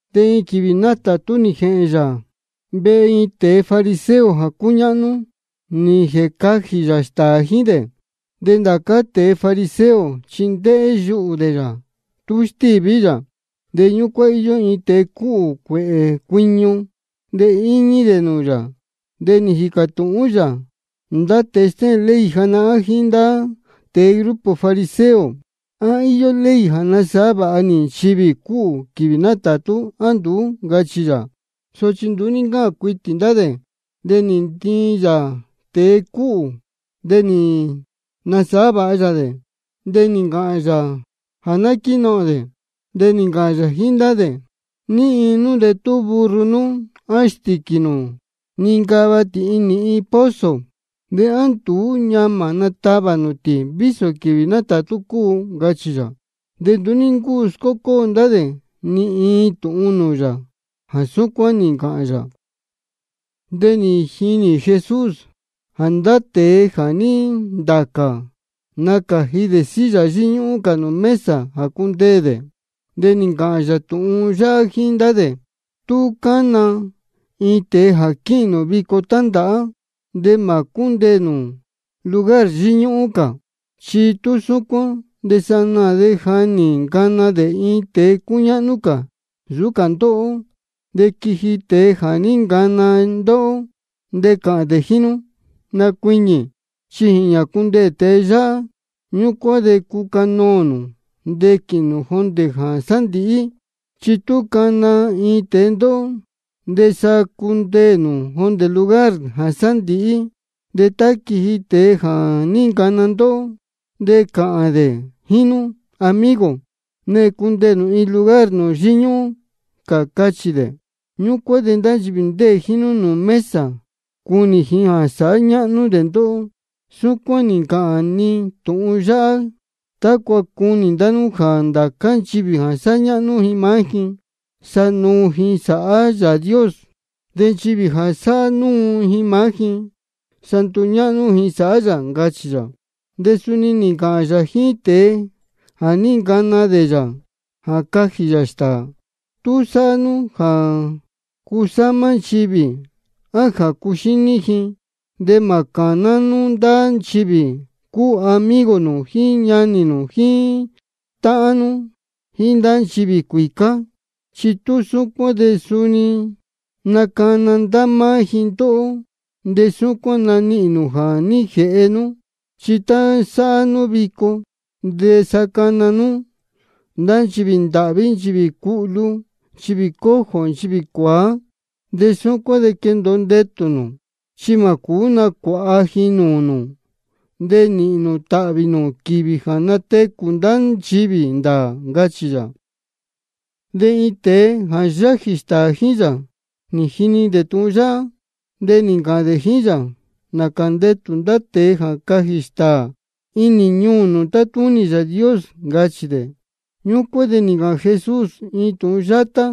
De iin quīvī nátātú nī jēhēn yā vehe iin tēe fariseo jā cúñáhnú, nī jēcajī yā stāā jíín dē. De ndá cā tēe fariseo chi ndéhé yuhū dē yā tú stíví yā. De ñúcuán íyó iin tēe cúhū cuēhē cuiñu, íñí dē nūū yā. De nī jīcā tūhún yā ndá tēe stéhēn ley janahán jíín ndá tēe grupo fariseo: ¿A íyó ley jā nasāhá vāha nī nchivī cúhū quīvī nátātú, á nduú? ncachī yā. Sochi nduú ní ncáhān cuitī ndá dē. De nī ntiin yā tēe cúhū, de nī nasāhá vāha yā dē, de nī ncāhān yā jā ná quínohōn dē. De nī ncāhān yā jíín ndá dē: ¿Ní iin nú de tú burro nú á stīquī nū nincava tī inī iin pozo, de á nduú ñamā natavā nū tī, vísō quīvī nátātú cúu? ncachī yā. De nduú ní ncúu scócóo ndá dē ni iin tūhun nūū yā jā súcuán nī ncāhān yā. De nī jinī Jesús jā ndá tēe jā ní ntacā, nácāji dē silla yíñúhún cā nūū mesa jā cundeē dē. De nī ncāhān yā tūhun yáhá jíín ndá dē: Tú cana iin tēe jā quíhīn nū vico tándāhá, de mā cúndeē nū lugar yíñúhún cā. Chi tú súcuán de sanaā de ja nī ncana dē iin tēe cúñáhnú cā nsūú cā ndóhó. De quiji tēe jā ní ncana ndóhó, de cāhān dē jíín nú: Nacuiñī, chi jīñā cundeē tēe yáhá. Ñúcuán de cucanoō nū de quīhīn nū jondē jā sándīhí. Chi tú cana iin tēe ndóhó, de sa cundeē nū jondē lugar jā sándīhí. De tá quiji tēe jā ní ncana ndóhó, de cāhān dē jíín nú: Amigo, nehēn cundeē nū iin lugar nūū yíñúhún cā, cachī dē. Ñúcuán de ndá nchivī ndéē jíín nú nūū mesa, cunī ji jā sáhá ñáhnú dē ndóhó. Súcuán nī ncāhān ni tūhun yáhá tácua cunī ndá nú jā ndācá nchivī jā sáhá ñáhnú ji maá ji, sa nuu ji sāhá Yāā Dios. De nchivī jā sáhá núu ji maá ji, sa nduñáhnú ji sāhá yā, ncachī yā. De suni nī ncāhān yā jíín tēe jā ní ncana dē yā jā cajī yā stāā: Tú sāhá nú jā cusámá nchivī á jā cuxíní ji, de mā cāná nú ndá nchivī cúu amigo nū jíín ñanī nū jíín táhán nú jíín ndá nchivī cuīcá. Chi tú súcuán de suni nacana ndá máá ji ndóhó, de súcuán nanihīn nū jā ní jēhe nú. Chi tá sáhá nú vico, de sa cana nú ndá nchivī ndāhví, nchivī cuhlu, nchivī cojo, nchivī cuāá. De súcuán de quendōo ndetū nū, chi mā cūú nacuāha ji nūū nū. De nīhīn nū tāhvī nū quīvī jā natecū ndá nchivī ndāā, ncachī yā. De iin tēe jā yájī stāā jíín yā, nī jini dē tūhun yáhá, de nī ncāhān dē jíín yā: Nācā ndetū ndá tēe jā cajī stāā inī ñuū nūū tátúnī Yāā Dios, ncachī dē. Ñúcuán de nī ncāhān Jesús iin tūhun yátá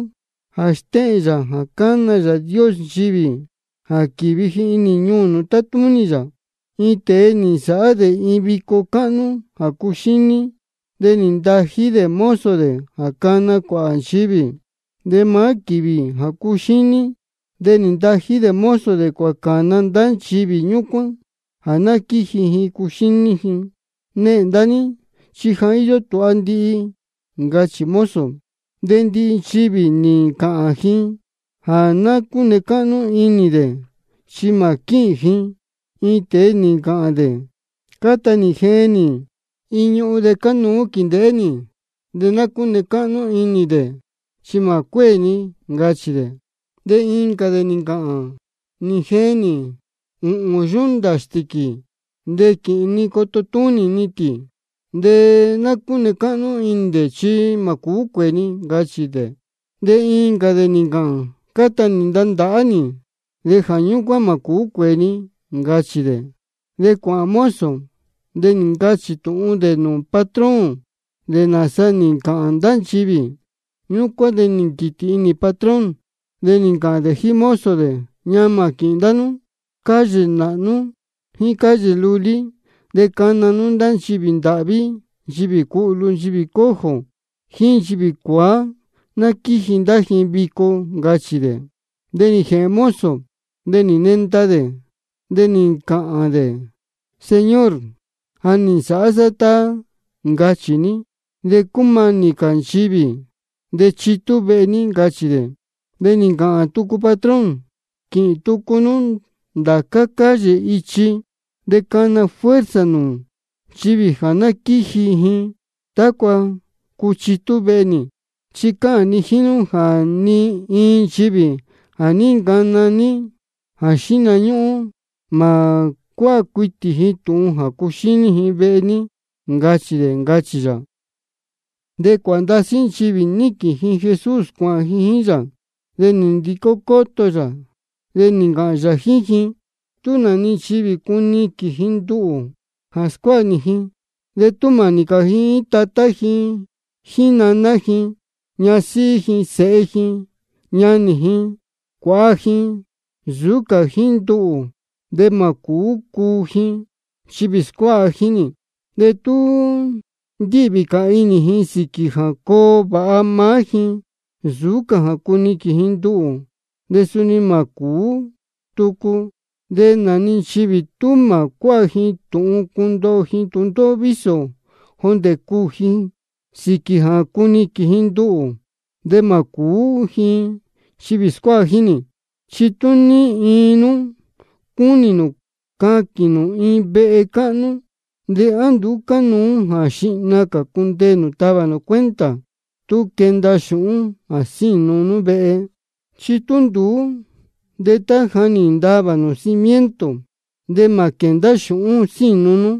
jā stéhēn yā jā cána Yāā Dios nchivī jā quīvi ji inī ñuū nūū tátúnī yā: Iin tēe nī nsāhá dē iin vico cáhnú jā cuxíní, de nī ntají dē mozo dē jā cana cuāhā nchivī. De maá quīvī jā cuxíní, de nī ntají dē mozo dē cuācāna ndá nchivī ñúcuán jā ná quíji ji cuxíní ji: Nehēn ndá ní, chi ja íyó tūha ndihi, ncachī mozo. De ndihi nchivī nī ncāhān ji jā ná cúne cáhnú inī dē chi mā quíhīn ji. Iin tēe nī ncāhān dē: Cáta nī jeen nī iin ñuhun de cánuú quīndēhé nī, de ná cúne cáhnú inī dē chi mā cuéē ni, ncachī dē. De incā dē nī ncāhān: Nī jeen nī ūhūn yunta stīquī, de quīhīn ni coto túnī ni tī, de ná cúne cáhnú inī dē chi mā cuéē ni, ncachī dē. De incā dē nī ncāhān: Cáta nī ntandāhá nī, de jā ñúcuán mā cūú cuēē ni, ncachī dē. De cuānohōn mozo, de nī ncachī tūhun dē nūū patrón dē nāsa nī ncāhān ndá nchivī. Ñúcuán de nī nquītī inī patrón, de nī ncāhān dē jíín mozo dē: Ñamā quīhīn nū ndá calle nāhnú jíín calle lulí, de cana nú ndá nchivī ndāhví, nchivī cuhlu, nchivī cojo, jíín nchivī cuāá, ná quíji ndá ji vico, ncachī dē. De nī jēhēn mozo, de nī nenda dē, de nī ncāhān dē: Señor, ja nī nsāhá sá tá ncachī ní, de cúmanī cā nchivī de chitú vehe ní, ncachī dē. De nī ncāhān tucu patrón: Quīhīn tucu nú ndācá calle jíín ichi, de cana fuerza nū nchivī ná quíji ji, tácua cuchitú vehe nī. Chi cáhān ni jíín nú jā ni iin nchivī jā ní ncana nī jā xíhna ñúhún, mā cuáha cuitī ni tūhun jā cuxíní ji vehe nī, ncachī dē, ncachī yā. De cuāhā ndasí nchivī níquīn ji Jesús cuāhān ji jíín yā, de nī ndicó cóto yā, de nī ncāhān yā jíín ji: Tú nā-ni nchivī cúnī ji cuniquīn ji nduhū jā scuáha nī ji, de tú mānī cā ji jíín tatá ji, naná ji, ñasíhí ji, sēhe ji, ñanī ji, cuāha ji, nsūú cā jíín nduhū, de mā cūú cuu ji nchivī scuáha jíín nī. De tú ndíhvī cā inī ji sīquī jā coo vāha maá ji nsūú cā jā cuniquīn ji nduhū, de suni mā cūú tucu. De nā-ni nchivī tú mā cuáha ji tūhun cundoho ji tūndóhó vísō jondē cuū ji sīquī jā cuniquīn ji nduhū, de mā cūú cuu ji nchivī scuáha jíín nī. Chi tú ní iin nú cúnī nū caquīn nū iin vehe cáhnú, ¿de á nduú cánuú jā xihna cā cundeē nū tavā nū cuenta tú quenda xūhún jā sínu nú vehe? Chi tú nduú, de tá ja nī ntavā nū cimiento, de mā quēndá xūhún sínu nú,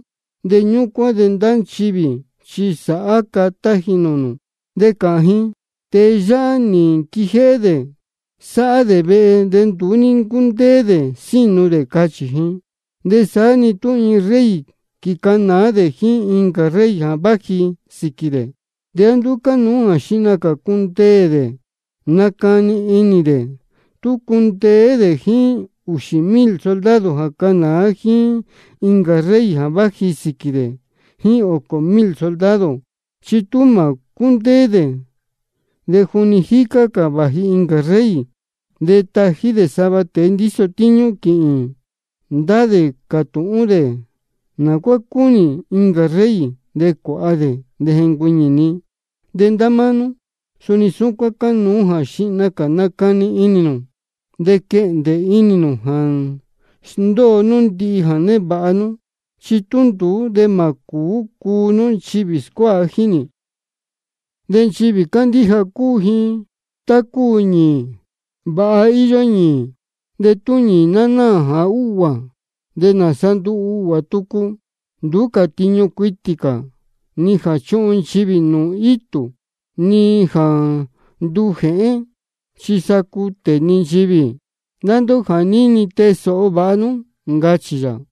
de ñúcuán de ndá nchivī chi sāhá catá ji nūū nū. De cāhān ji: Tēe yáhá chi nī nquijéhé dē sáhá dē vehe, de nduú ní ncúndéé dē sínu dē, cachī ji. De saá-ni tú iin rey quīcanāá dē jíín incā rey jā váji sīquī dē, ¿de á nduú cánuú jā xihna cā cundeē dē nacani inī dē tú cundeé dē jíín ūxī mil soldado jā canāá dē jíín incā rey jā váji sīquī dē jíín ōcō mil soldado? Chi tú mā cúndéé dē, de juni jícá cā vāji incā rey, de tají dē sava tēe ndíso tíñú jā quíhīn ndá dē cātūhún dē nā cuá cúnī incā rey jā cuāha dē, de jencuiñī-ni. De ndá máá nú, suni súcuán cánuú jā xihna cā nacani inī nū de quehndē inī nū jā sndóo nú ndihi jā névāha nú, chi tú nduú de mā cūú cuu nú nchivī scuáha jíín nī. De nchivī cándíja cúu ji tá cúu ñīī. Vāha íyó ñīī, de tú ñīī ná náā jā úhguā, ¿de nāsa nduu uhguā tucu? Nduú cā tiñu cuitī cā, ni jā chuhun nchivī nūū itū, ni jā nduu jēhen, chi sa cutē-ni nchivī. Ndá ndóhó jā níni, tee sōho vāha nú, ncachī yā.